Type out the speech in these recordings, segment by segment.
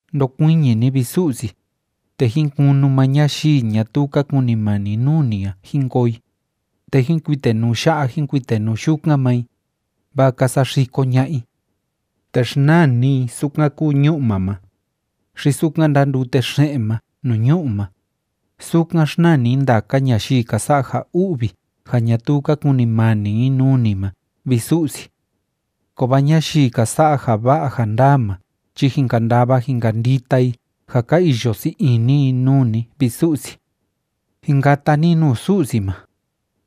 Ndokuiñi ni, vi Su'si, te jín kunu maa ñayii ñatuu ka kunimani nuu ni a jín koo i, te jín kuitenuu ya'a jín kuitenuu yukan maa i, vaa ka saxiko ña'a i. Te xnaa ni i sukan kúu ñu'ma ma, xi sukan ndándute xe'en ma nuu ñu'u ma, sukan xnaa ni ndaka ñayii ka sa'a ja u'vi ja ñatuu ka kunimani i nuu ni ma, vi Su'si. Kovaa ñayii ka sa'a ja va'a ja ndaa ma chi jin kandava jin kandita i ja ka iyo sii ini i nuu ni, vi Su'si. Jin kata ni nuu Su'si ma.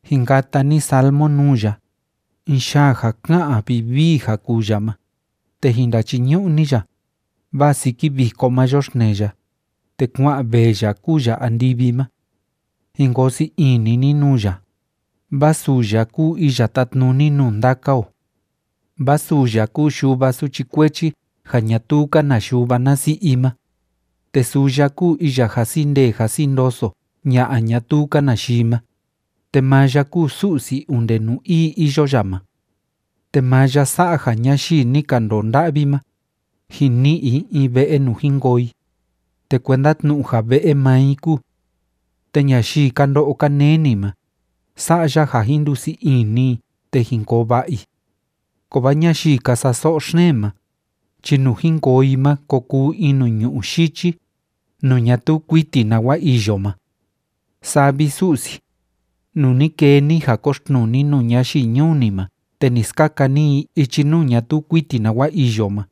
Jin kata ni salmo nuu ya, in yaa ja ká'an vivii ja kuu ya ma, te jin ndachiñu'u ni ya, vaa siki viko ma yoxtnee ya, te kua'an vee ya kúu ya andivi ma. Jin koo sii ini ni nuu ya, vaa suu ya kúu iya tátnuni nuu ndaka o. Vaa suu ya kúu yuva suchi kuechi ja ñatuu‑ka na yuva na si'i i ma, te suu ya kúu iya jasi ndee jasi ndoso ña'a ñatuu‑ka na yii ma, te maa ya kúu Su'si onde nuu ii iyo ya ma. Te maa ya sa'a ja ñayii ni ka ndoo nda'vi ma, jin ni'i i in ve'e nuu jin koo i, te kuenda tnu'u ja ve'e maa i kúu. Te ñayii ka ndo'o ka neni ma, sa'a ya ja jin ndusii ini i te jin koo va'a i. Kovaa ñayii ka sa'a so'o xeen ma chi nuu jin koo i ma ko kuu in nuu ñu'ú yichi, nuu ñatuu kuiti nawa iyo ma. Saa vi, Su'si, nuu ni kee ni ja koxtnuu ni nuu ñayii ñuu ni ma te ni skaka ni i ichi nuu ñatuu kuiti nawa iyo ma,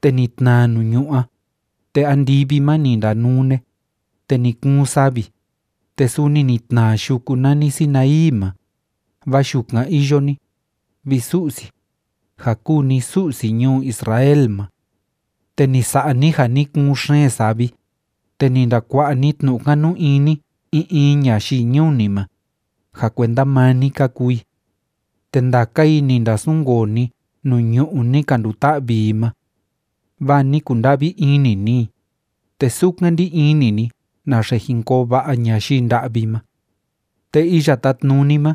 te ni tnaa nuu ñu'ú a, te andivi ma ni ndanune, te ni kuun savi, te suni ni tnaa yuku nani Sinaí ma, vaa yukan iyo ni, vi Su'si, ja kúu ni Su'si ñuu Israel ma. Te ni sa'a ni ja ni kuun xeen savi, te ni ndakua'a ni tnu'u kanu ini in in ñayii ñuu ni ma, ja kuenda maa ni ka kuu i. Te ndaka i ni ndasunkoo ni nuu ñu'ú ni ka nduta'vi i ma. Vaa ni kunda'vi ini ni i, te sukan ndí ini ni naxe jin koo va'a ñayii nda'vi ma. Te Iya Tátnuni ma,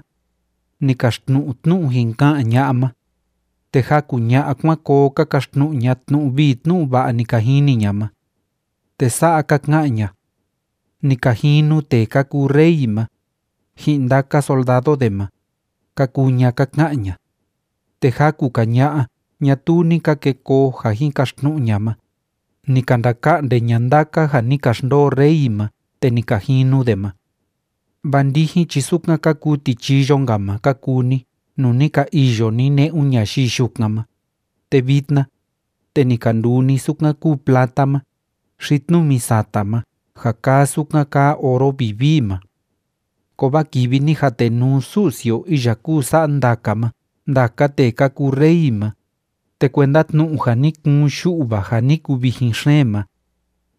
ni kaxtnu'u tnu'u jin ka'an ña'a ma, te jaku ña'a kuan koo ka kaxtnu'u ña tnu'u vii tnu'u va'a ni ka jini ña ma. Te sa'a ka ka'an ña: “Ni ka jinu tee ka kuu rey ma, ji'in ndaka soldado de ma”, ka kuu ña ka ka'an ña. Te jaku‑ka ña'a ñatuu ni ka ke koo ja jin kaxtnu'u ña ma, ni ka ndaka'nde ña ndaka ja ni ka xndoo rey ma te ni ka jinu de ma. Vaa ndijin chi sukan ka kuu tichiyo‑nka ma ka kuu ni nuu ni ka iyo ni ne'un ñayii yukan ma, te vitna, te ni ka nduu ni sukan kúu plata ma, xi tnumi sata ma ja kaa sukan kaa oro vivii ma. Kovaa kivi ni jatenuu Su'si o iya kúu sa'a ndaka ma ndaka tee ka kuu rey ma, te kuenda tnu'u ja ni kuun yu'va ja ni kuvijin xeen ma,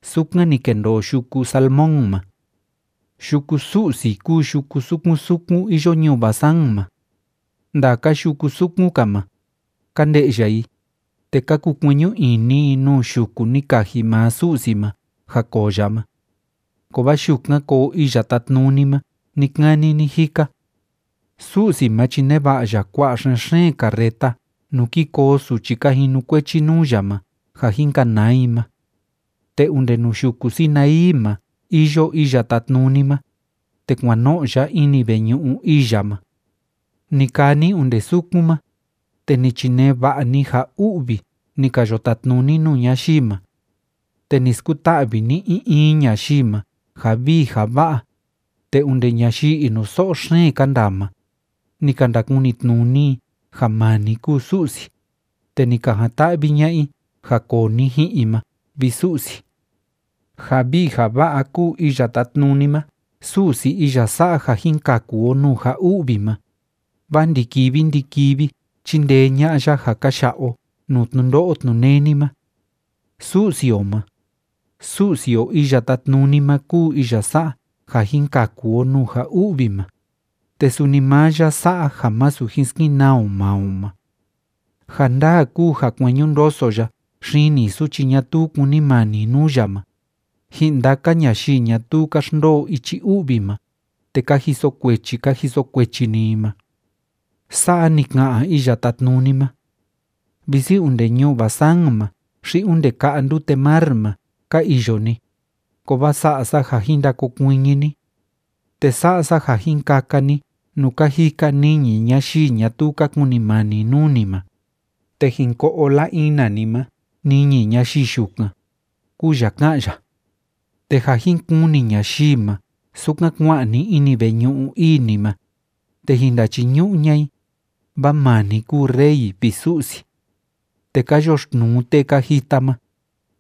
sukan ni kendoo yuku Salmón ma. Yuku Su'si kúu yuku sukun sukun iyo ñuu Basán ma. Ndaka yuku sukun‑ka ma, ka nde'ya i, te ka kukueñu ini i nuu yuku ni kaji maa Su'si ma ja koo ya ma. Kovaa yukan koo Iya Tátnuni ma ni‑kani ni‑jika. Su'si ma chi neva'a ya kua'a xen‑xeen carreta nuu ki koo suchi ka jinukuechi nuu ya ma ja jin kanaa i ma. Te onde nuu yuku Sinaí ma iyo Iya Tátnuni ma, te kuan no'o ya ini veñu'u ii ya ma. Ni kaa ni onde sukun ma, te ni chinee va'a ni ja u'vi ni ka yo tatnuni nuu ñayii ma. Te ni skuta'vi ni in in ñayii ma ja vii ja va'a, te onde ñayii inuso'o xeen ka ndaa ma, ni ka ndakunitnuni i ja maa ni kúu Su'si, te ni ka jan‑ta'vi ña'a i ja koo ni ji'in i ma, vi Su'si. Ja vii ja va'a kúu Iya Tátnuni ma Su'si iya sa'a ja jin kaku o nuu ja u'vi ma, vaa ndi‑kivi ndi‑kivi chíndee ña'a ya ja ka ya'a o nuu tnundo'o tnuneni ma. Su'si o ma, Su'si o Iya Tátnuni ma kúu iya sa'a ja jin kaku o nuu ja u'vi ma, te suni maa ya sa'a ja masu jin skenaa o maa o ma. Ja ndaa kúu ja kueñu ndoso ya xini suchi ñatuu kunimani nuu ya ma, ji'in ndaka ñayii ñatuu ka xndoo ichi u'vi ma, te ka jiso kuechi ka jiso kuechi‑ni i ma. Sa'a ni ka'an Iya Tátnuni ma: “Visi onde ñuu Basán ma xi onde ka'a ndute mar ma ka iyo ni, kovaa sa'a sa ja jin ndakokuiñi ni. Te sa'a sa ja jin kaka ni nuu ka jika niñi ñayii ñatuu ka kunimani nuu ni ma, te jin ko'o la‑ina ni ma niñi ñayii yukan”, kúu ya ká'an ya. Te ja jin kuni ñayii ma sukan kua'an ni ini veñu'u ii ni ma, te jin ndachiñu'u ña'a i, vaa maa ni kúu Rey, vi Su'si. Te ka yoxtnuu tee ka jita ma,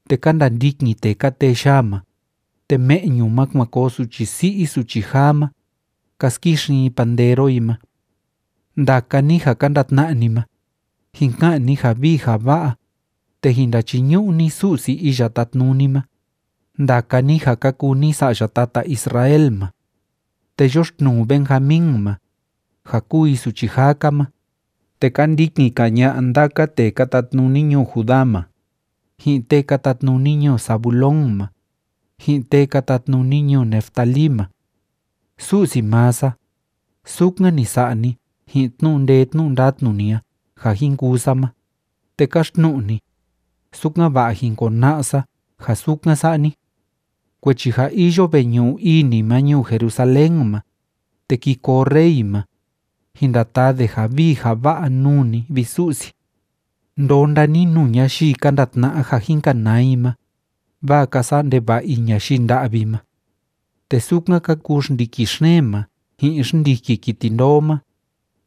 te ka ndandikin tee ka tee yaa ma, te me'ñu ma kuan koo suchi si'i suchi jaa ma, ka skixin i pandero i ma. Ndaka ni ja ka ndatna'a ni ma, jin ka'an ni ja vii ja va'a, te jin ndachiñu'u ni Su'si Iya Tátnuni ma, ndaka ni ja ka kuu ni sa'ya tata Israel ma. Te yoxtnuu Benjamín ma, ja kúu i suchi jaa‑ka ma, te ka ndikin‑ka ña'a ndaka tee ka tatnuni ñuu Judá ma, ji'in tee ka tatnuni ñuu Zabulón ma, ji'in tee ka tatnuni ñuu Neftalí ma. Su'si maa sa, sukan ni sa'a ni ji'in tnu'u ndee tnu'u ndatnu ni a ja jin kuu sa ma, te káxtnu'u ni, sukan‑va'a jín kona'a sa ja sukan sa'a ni. Kuechi ja iyo veñu'u ii ni ma ñuu Jerusalén ma, te ki koo rey ma, jin ndataa de ja vii ja va'a nuu ni, vi Su'si. Ndonda ni nuu ñayii ka ndatna'a ja jin kanaa i ma, vaa ka sa'a ndeva'a i ñayii nda'vi ma. Te sukan ka kuu xndiki xeen ma ji'in xndiki kiti ndoo ma,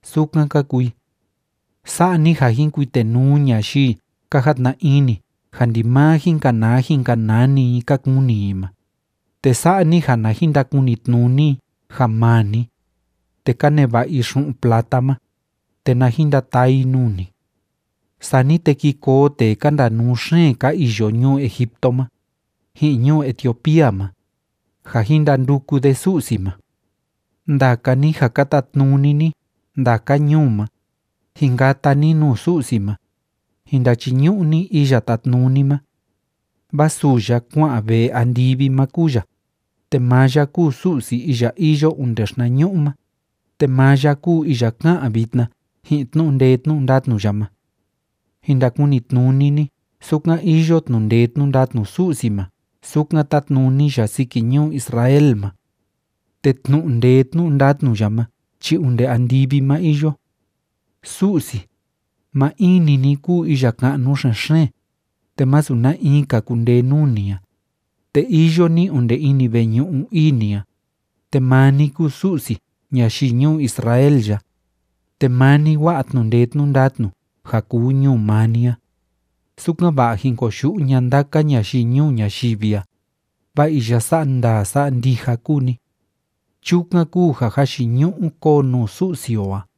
sukan ka kuu i. Sa'a ni ja jin kuitenuu ñayii ka jatna ini ja ndimaa jin kanaa jin kanaa‑ni i ka kuni i ma, te sa'a ni ja na jin ndakunitnuni i ja maa ni, te ka neva'a i xu'un plata ma, te na jin ndataa i nuu ni. Sani te ki koo tee ka ndanuu xeen ka iyo ñuu Egipto ma, ji'in ñuu Etiopía ma, ja jin ndanduku de Su'si ma. Ndaka ni ja ka tatnuni ni ndaka ñuu ma, jin kata ni nuu Su'si ma, jin ndachiñu'u ni Iya Tátnuni ma. Vaa suu ya kua'an vee andivi ma kúu ya, te maa ya kúu Su'si iya iyo onde xinañu'u ma, te maa ya kúu iya ká'an vitna ji'in tnu'u ndee tnu'u ndatnu ya ma. Jin ndakunitnuni ni sukan iyo tnu'u ndee tnu'u ndatnu Su'si ma sukan tátnuni ya siki ñuu Israel ma. Te tnu'u ndee tnu'u ndatnu ya ma chi onde andivi ma iyo. Su'si, maa in‑ni ni kúu iya ka'nu xen‑xeen, te masu na in‑ka kundee nuu ni a, te iyo ni onde ini veñu'u ii ni a, te maa ni kúu Su'si ñayii ñuu Israel ya, te maa ni wa'a tnu'u ndee tnu'u ndatnu ja kuu ñuu maa ni a, sukan‑va'a jin koyu'u ña'a ndaka ñayii ñuu ñayivi a, vaa iya sa'a ndaa sa'a ndija kúu ni. Chukan kúu ja jayiñu'u kóo nuu Su'si o a.